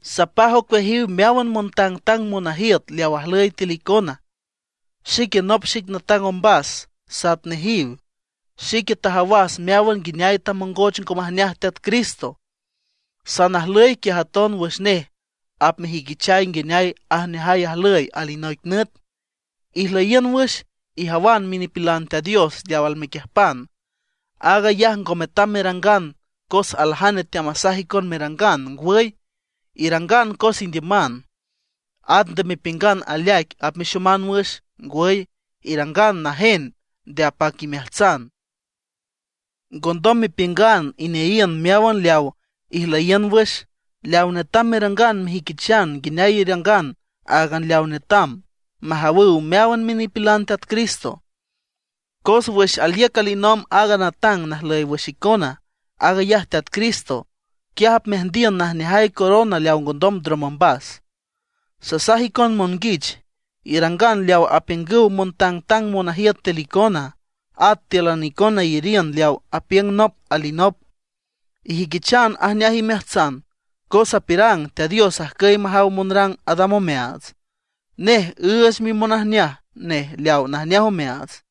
Sapaj ocueajiw meáwan montangtang monajiüt leaw ajlüy tiül icona. Xique nop xic natang ombas sat nejiw. Xique tajawas meáwan nguineay tamongoch ngo majneaj Teat Cristo. Sanajlüy quiaj aton wüx nej apmejüiquichay nguineay ajneajay ajlüy alinoic nüt. Ijlüyiün wüx, ijawan minipilan Teat Dios leaw almequiüjpan. Aag ayaj ngo metam merangan cos aljane teamasaj icon merangan; ngwüy, irangan cos indiüman. At nde mepiüngan aleaic apmexoman wüx; ngwüy, irangan najen nde apac imeajtsan. Ngondom mepiüngan ineayiün meáwan leaw ijlüyiün wüx. Leaw netam merangan, mejüiquichan nguineay irangan áagan leaw netam, majawüw meáwan minipilan Teat Cristo. Cos wüx aliüc alinomb aaga natang najlüy wüx icona, aag ayaj Teat Cristo, quiaj apmeajndiün najneajay corona leawa ngondom ndrom ombas. Sasaj icon monguich, irangan leawa apiüngüw montangtang monajiüt tiül icona. At tíülan icona iyariün leaw apiüng nop alinop; ijüiquichan ajneaj imeajtsan, cos apiürang: Teat Dios ajcüy majaw monrang adam omeaats. Nej üüch mimonajneaj nej leaw najneaj omeaats.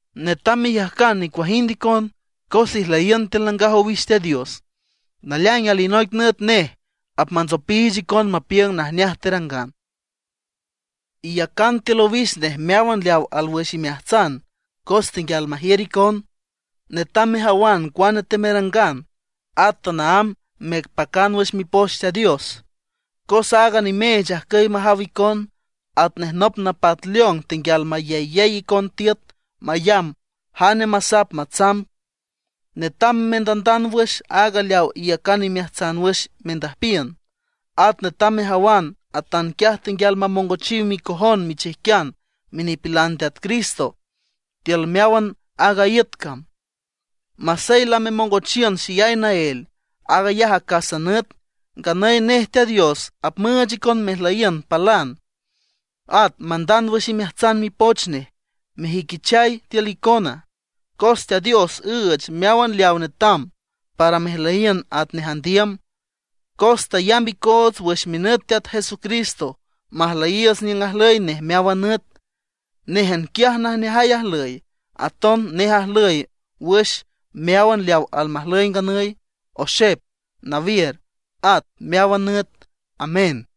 Netam meyajcan nicuajind icon, cos ijlüyiün tiül nangaj owix Teat Dios; naleaing alinoic nüt nej apmantsopiich icon mapiüng najneaj terangan. Iyacan tiül owix nej meáwan leaw alwüx imeajtsan cos tenguial majiür icon. Netam mejawan cuane temerangan, at tanaámb mepacan wüx Mipoch Teat Dios, cos aaga nimeech ajcüy majaw icon, atnej nop napat leon tenguial mayeyey icon tiüt mayamb jane masap matsamb. Netam mendandand wüx aaga leaw iyacan imeajtsan wüx mendüjpiün. At netam mejawan atanquiaj tenguial mamongochiw micojon michijquian minipilan Teat Cristo tiül meáwan aaga iüt cam. Masey lamemongochiün xeyay naél, aag ayaj acásan nüt. Nganüy nej Teat Dios apmüüch icon mejlüyiün palan, at mandand wüx imeajtsan Mipoch nej, mejüiquichay tiül icona. Cos Teat Dios üüch meáwan leaw netam para mejlüyiün atnej andiüm, cos tayamb icoots wüx minüt Teat Jesucristo majlüyiiüts niüng ajlüy nej meáwan nüt. Néjan quiaj najneajay ajlüy. Aton nej ajlüy wüx meáwan leaw almajlüy nganüy, oxep, nawiür, at meáwan nüt. Amén.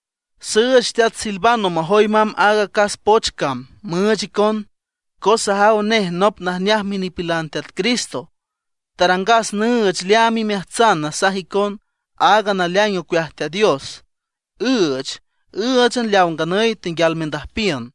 Süüch teat Silvano majoy mamb aaga acás poch cam müüch icon, cos sajaw nej nop najneaj minipilan Teat Cristo. Tarangas nüüch leaam imeajtsan nasaj icon aaga naleaing ocueaj Teat Dios, üüch ǘüchan leaw nganüy tenguial mendüjpiün.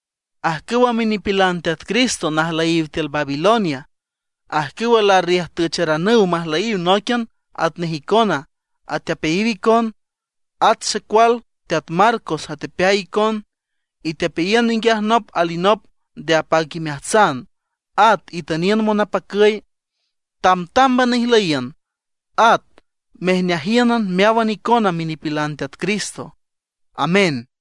Ajcüwa minipilan Teat Cristo najlüyiw tiül Babilonia, ajcüwa larriüjtücharanüw majlüyiw nóiquian atnej icona, atepeayiw icon. At xecual teat Marcos atepeay icon. Itepeayiün ninguiaj nop alinop nde apac imeajtsan, at itüniün monapacüy. Tamtámban ijlüyiün, at mejneajíünan meáwan icona minipilan Teat Cristo. Amén.